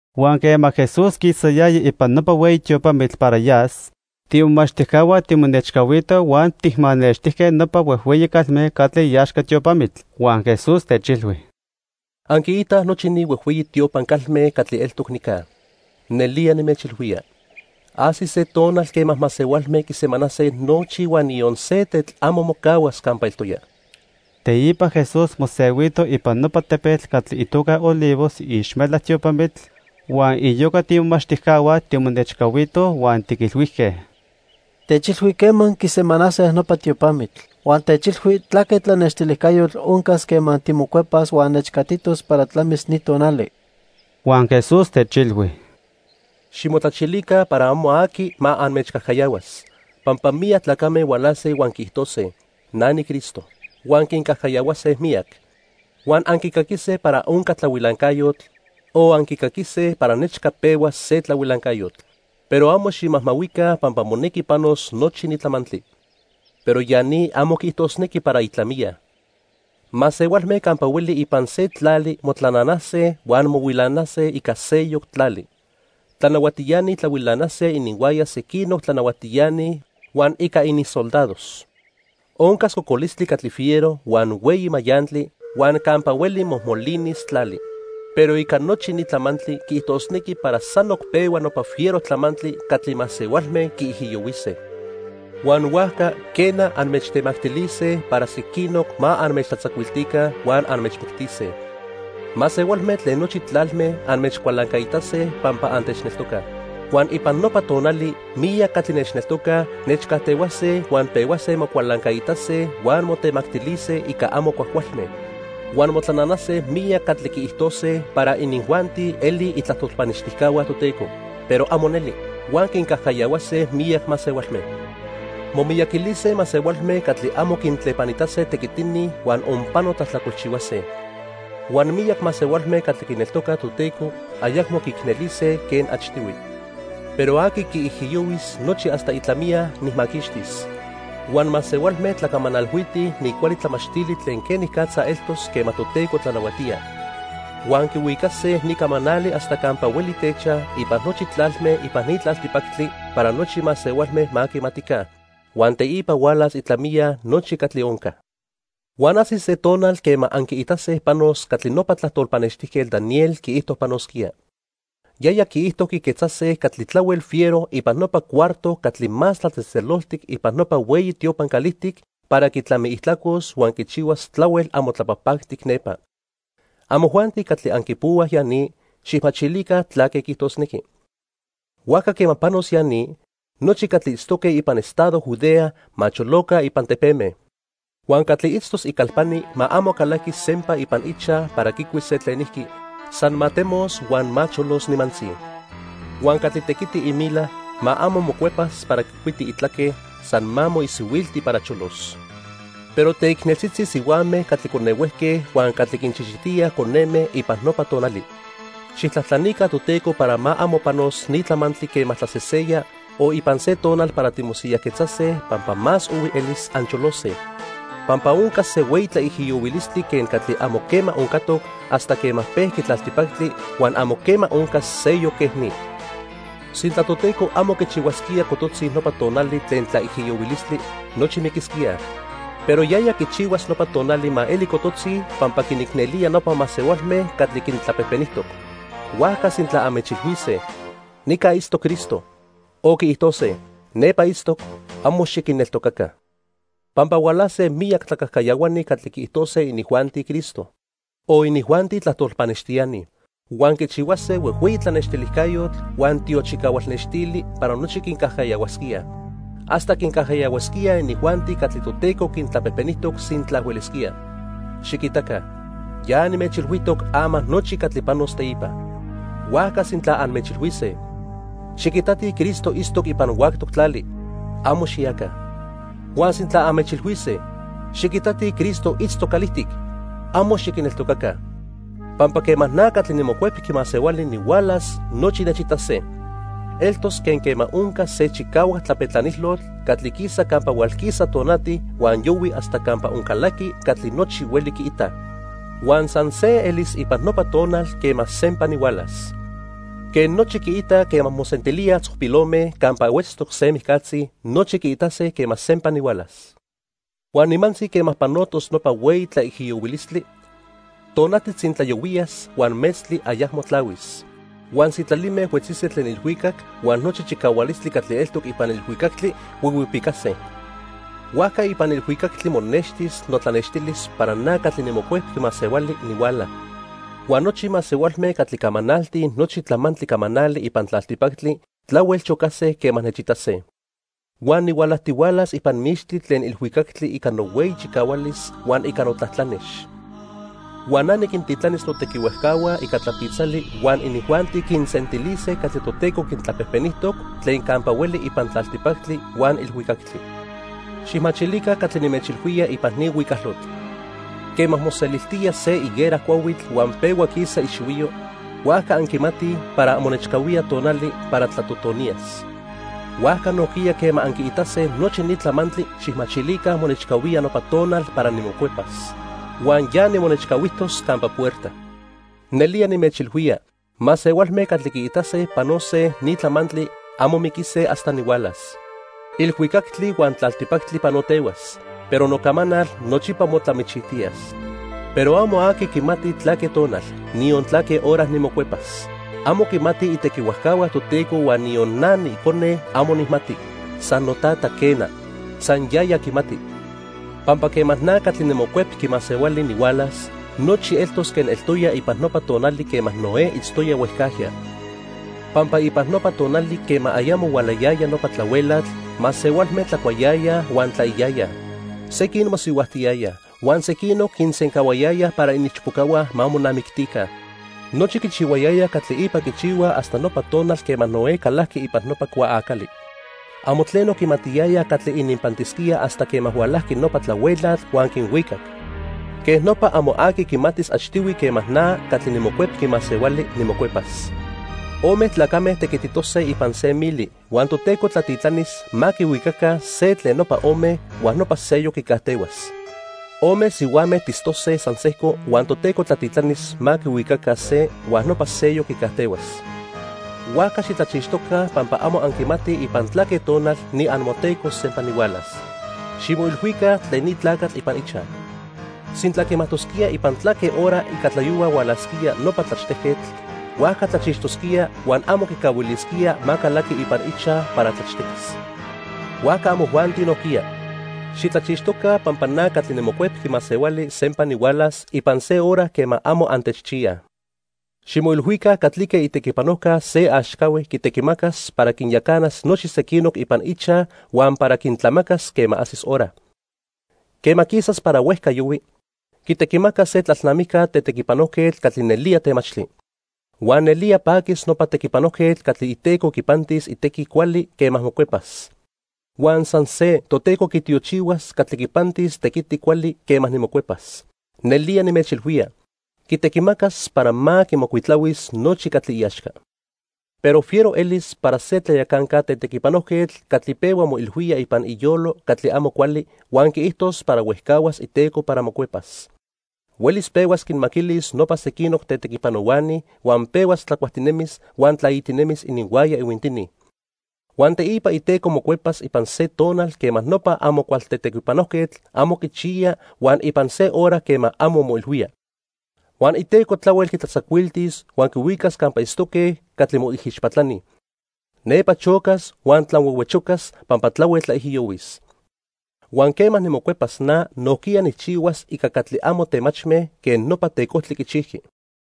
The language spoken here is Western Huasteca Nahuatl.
Huan quema Jesús quisayaya ipan nopa hueyi tiopamitl para yas, tiimomachtijcahua timonechcahuitoj huan tijmanextijque nopa huejhueyi calme catli iaxca tiopamitl. Huan Jesús techilhui: —Anquiitaj nochi ni huejhueyi tiopan calme catli eltoc nica. Nelía nimechilhuía, ajsis se tonal quema masehualme quisemanase nochi huan niyon se tetl amo mocahuas campa eltoya. Teipa Jesús mosehuito ipan nopa tepetl catli itoca Olivos iixmelac tiopamitl, huan iyoca tiimomachtijcahua timonechcahuitoj huan tiquilhuijque: —Techilhui quema quisemanase nopa tiopamitl. Huan techilhui tlaque tlanextilijcayotl oncas quema timocuepas huan nechcatitos para tlamis ni tonali. Huan Jesús techilhui: —Ximotlachilica para amo aqui ma anmechcajcayahuas. Pampa miyac tlacame hualase huan quiijtose: 'Na niCristo.' Huan quincajcayahuase miyac. Huan anquicaquise para onca tlahuilancayotl o anquicaquise para nechca pehuas se tlahuilancayotl. Pero amo ximajmahuica pampa monequi panos nochi ni tlamantli. Pero ya ni amo quiijtosnequi para itlamiya. Masehualme campa hueli ipan se tlali motlananase huan mohuilanase ica seyoc tlali. Tlanahuatiani tlahuilanase ininhuaya sequinoc tlanahuatiani huan ica ininsoldados. Oncas cocolistli catli fiero, huan hueyi mayantli, huan campa hueli mojmolinis tlali. Pero ica nochi ni tlamantli quiijtosnequi para sanoc pehua nopa fiero tlamantli catli masehualme quiijiyohuise. "Huan huajca, quena, anmechtemactilise para sequinoc ma anmechtlatzacuiltica huan anmechmictise. Masehualme tlen nochi tlalme anmechcualancaitase pampa antechneltocaj. Huan ipan nopa tonali miyac catli nechneltocaj nechcajtehuase huan pehuase mocualancaitase huan motemactilise ica amo cuajcualme. "Huan motlananase miyac catli quiijtose para inijuanti elij itlajtol pannextijcahua Toteco, pero amo neli, huan quincajcayahuase miyac masehualme. Momiyaquilise masehualme catli amo quintlepanitase tequitini huan onpano tlajtlacolchihuase. Huan miyac masehualme catli quineltocaj Toteco ayacmo quiicnelise quen achtihui. Pero aqui quiijiyohuis nochi hasta itlamiya, nijmaquixtis. Huan masehualme tlacamanalhuitij ni cuali tlamachtili tlen quenicatza eltos quema Toteco tlanahuatía. Huan quihuicase ni camanali hasta campa hueli techaj ipan nochi tlalme ipan ni tlaltipactli para nochi masehualme ma quimatica. Huan teipa hualas itlamiya nochi catli onca. "Huan ajsis se tonal quema anquiitase panos catli nopa tlajtol pannextijquetl Daniel quiijto panosquía. Yaya quiijto quiquetzase catli tlahuel fiero ipan nopa cuarto catli Más Tlatzejtzeloltic ipan nopa hueyi tiopan calijtic para quitlamiijtlacos huan quichihuas tlahuel amo tlapajpactic nepa. (Amojuanti catli anquipohuaj ya ni, xijmachilica tlaque quiijtosnequi.) Huajca quema panos ya ni, nochi catli itztose ipan estado Judea ma choloca ipan tepeme. Huan catli itztos icalpani ma amo calaquis sempa ipan ichaj para quicuis se tlenijqui, san ma temos huan ma cholos nimantzi. Huan catli tequiti imila, ma amo mocuepas para quicuiti itlaque, san ma moisihuilti para cholos. ¡Pero teicneltzitzi sihuame catli conehuejque huan catli quinchichitíaj coneme ipan nopa tonali! Xijtlajtlanica Toteco para ma amo panos ni tlamantli quema tlaseseya o ipan se tonal para timosiyajquetzase pampa más ohui elis ancholose. Pampa oncas se hueyi tlaijiyohuilistli quen catli amo quema oncatoc hasta quema pejqui tlaltipactli huan amo quema oncas seyoc quej ni. Sintla Toteco amo quichihuasquía cototzi nopa tonali tlen tlaijiyohuilistli, nochi miquisquíaj. Pero yaya quichihuas nopa tonali ma eli cototzi pampa quinicnelía nopa masehualme catli quintlapejpenijtoc. "Huajca sintla anmechilhuise: 'Nica itztoc Cristo', o quiijtose: 'Nepa itztoc', amo xiquinneltocaca. Pampa hualase miyac tlacajcayahuani catli quiijtose inijuanti Cristo, o inijuanti tlajtol pannextiani. Huan quichihuase huejhueyi tlanextilijcayotl huan tiochicahual nextili para nochi quincajcayahuasquíaj. Hasta quincajcayahuasquíaj inijuanti catli Toteco quintlapejpenijtoc sintla huelisquía. Xiquitaca, ya nimechilhuijtoc ama nochi catli panos teipa. "Huajca sintla anmechilhuise: 'Xiquitatij Cristo itztoc ipan huactoc tlali', amo xiyaca. Huan sintla anmechilhuise: 'Xiquitatij Cristo itztoc calijtic', amo xiquinneltocaca. Pampa quema na catli niMocuepqui Masehuali nihualas, nochi nechitase. Eltos quen quema onca se chicahuac tlapetlanilotl catli quisa campa hualquisa tonati huan yohui hasta campa oncalaqui catli nochi huelij quiitaj. Huan san se elis ipan nopa tonal quema sempa nihualas. Quen nochi quiitaj quema mosentilíaj tzopilome campa huetztoc se mijcatzi, nochi quiitase quema sempa nihualas. "Huan nimantzi quema panotos nopa hueyi tlaijiyohuilistli, tonati tzintlayohuiyas huan metztli ayacmo tlahuis. Huan sitlalime huetzise tlen ilhuicac huan nochi chicahualistli catli eltoc ipan ilhuicactli huihuipicase. Huajca ipan ilhuicactli monextis notlanextilis para na catli niMocuepqui Masehuali nihuala, huan nochi masehualme catli camanaltij nochi tlamantli camanali ipan tlaltipactli tlahuel chocase quema nechitase. Huan nihualajtihualas ipan mixtli tlen ilhuicactli ica nohueyi chicahualis huan ica notlatlanex. Huan na niquintitlanis notequihuajcahua ica tlapitzali huan inijuanti quinsentilise catli Toteco quintlapejpenijtoc tlen campa hueli ipan tlaltipactli huan ilhuicactli. "Xijmachilica catli nimechilhuía ipan ni huicalotl. Quema moseliltía se higuera cuahuitl huan pehua quisa ixihuiyo, huajca anquimatij para monechcahuía tonali para tlatotoniyas. Huajca nojquiya quema anquiitase nochi ni tlamantli, xijmachilica monechcahuía nopa tonal para nimocuepas. Huan ya nimonechcahuijtos campa puerta. Nelía nimechilhuía, masehualme catli quiitase panose ni tlamantli amo miquise hasta nihualas. Ilhuicactli huan tlaltipactli panotehuas, pero nocamanal nochipa motlamichijtiyas. "Pero amo aqui quimati tlaque tonal, niyon tlaque hora nimocuepas. Amo quimatij itequihuajcahua Toteco huan niyon na niIcone amo nijmati, san noTata, quena. San yaya quimati. "Pampa quema na catli niMocuepqui Masehuali nihualas, nochi eltos quen eltoya ipan nopa tonali quema Noé itztoya huejcajya. Pampa ipan nopa tonali quema ayamo hualayaya nopa tlahuelatl, masehualme tlacuayayaj huan tlaiyayaj. Sequin mosihuajtiyayaj huan sequinoc quisencahuayayaj para iniichpocahua ma monamictica. Nochi quichihuayayaj catli ipa quichihuaj hasta nopa tonal quema Noé calajqui ipan nopa cuaacali. Amo tleno quimatiyayaj catli ininpantisquía hasta quema hualajqui nopa tlahuelatl huan quinhuicac. Quej nopa amo aqui quimatis achtihui quema na catli niMocuepqui Masehuali, nimocuepas. Ome tlacame tequititose ipan se mili huan Toteco tlatitlanis ma quihuicaca se tlen nopa ome huan nopa seyoc quicajtehuas. Ome sihuame tistose san sejco huan Toteco tlatitlanis ma quihuicaca se, huan nopa seyoc quicajtehuas. "Huajca xitlachixtoca pampa amo anquimatij ipan tlaque tonal niamoTeco sempa nihualas. Ximoilhuica tlen ni tlacatl ipan ichaj. Sintla quimajtosquía ipan tlaque hora ica tlayohua hualasquía nopa tlachtejquetl, huajca tlachixtosquía huan amo quicahuilisquía ma calaqui ipan ichaj para tlachtequis. Huajca amojuanti nojquiya, xitlachixtoca pampa na catli niMocuepqui Masehuali sempa nihualas ipan se hora quema amo antechchiyaj. "Ximoilhuica catlique itequipanojca se axcahue quitequimacas para quinyacanas nochi sequinoc ipan ichaj huan para quintlamacas quema ajsis hora. Quema quisas para huejca yohui, quitequimacas se tlalnamijca tetequipanojquetl catli nelía temachtli. Huan nelía paquis nopa tequipanojquetl catli iteco quipantis tequiti cuali quema mocuepas. Huan san se Toteco quitiochihuas catli quinpantis tequiti cuali quema nimocuepas. Nelía nimechilhuía, quitequimacas para ma quimocuitlahuis nochi catli iaxca. Pero fiero elis para se tlayacanca tetequipanojquetl catli pehua moilhuía ipan iyolo catli amo cuali huan quiijtos para huejcahuas iteco para mocuepas. Huelis pehuas quinmaquilis nopa sequinoc tetequipanohuani huan pehuas tlacuajtinemis huan tlaitinemis ininhuaya ihuintini. Huan teipa iteco mocuepas ipan se tonal quema nopa amo cual tetequipanojquetl amo quichiya huan ipan se hora quema amo moilhuía. Huan iteco tlahuel quitlatzacuiltis huan quihuicas campa itztoque catli moijixpatlani. Nepa chocas huan tlanhuehuechocas pampa tlahuel tlaijiyohuis. Huan quema nimocuepas na nojquiya nijchihuas ica catli amo temachme quen nopa tecojtli quichijqui.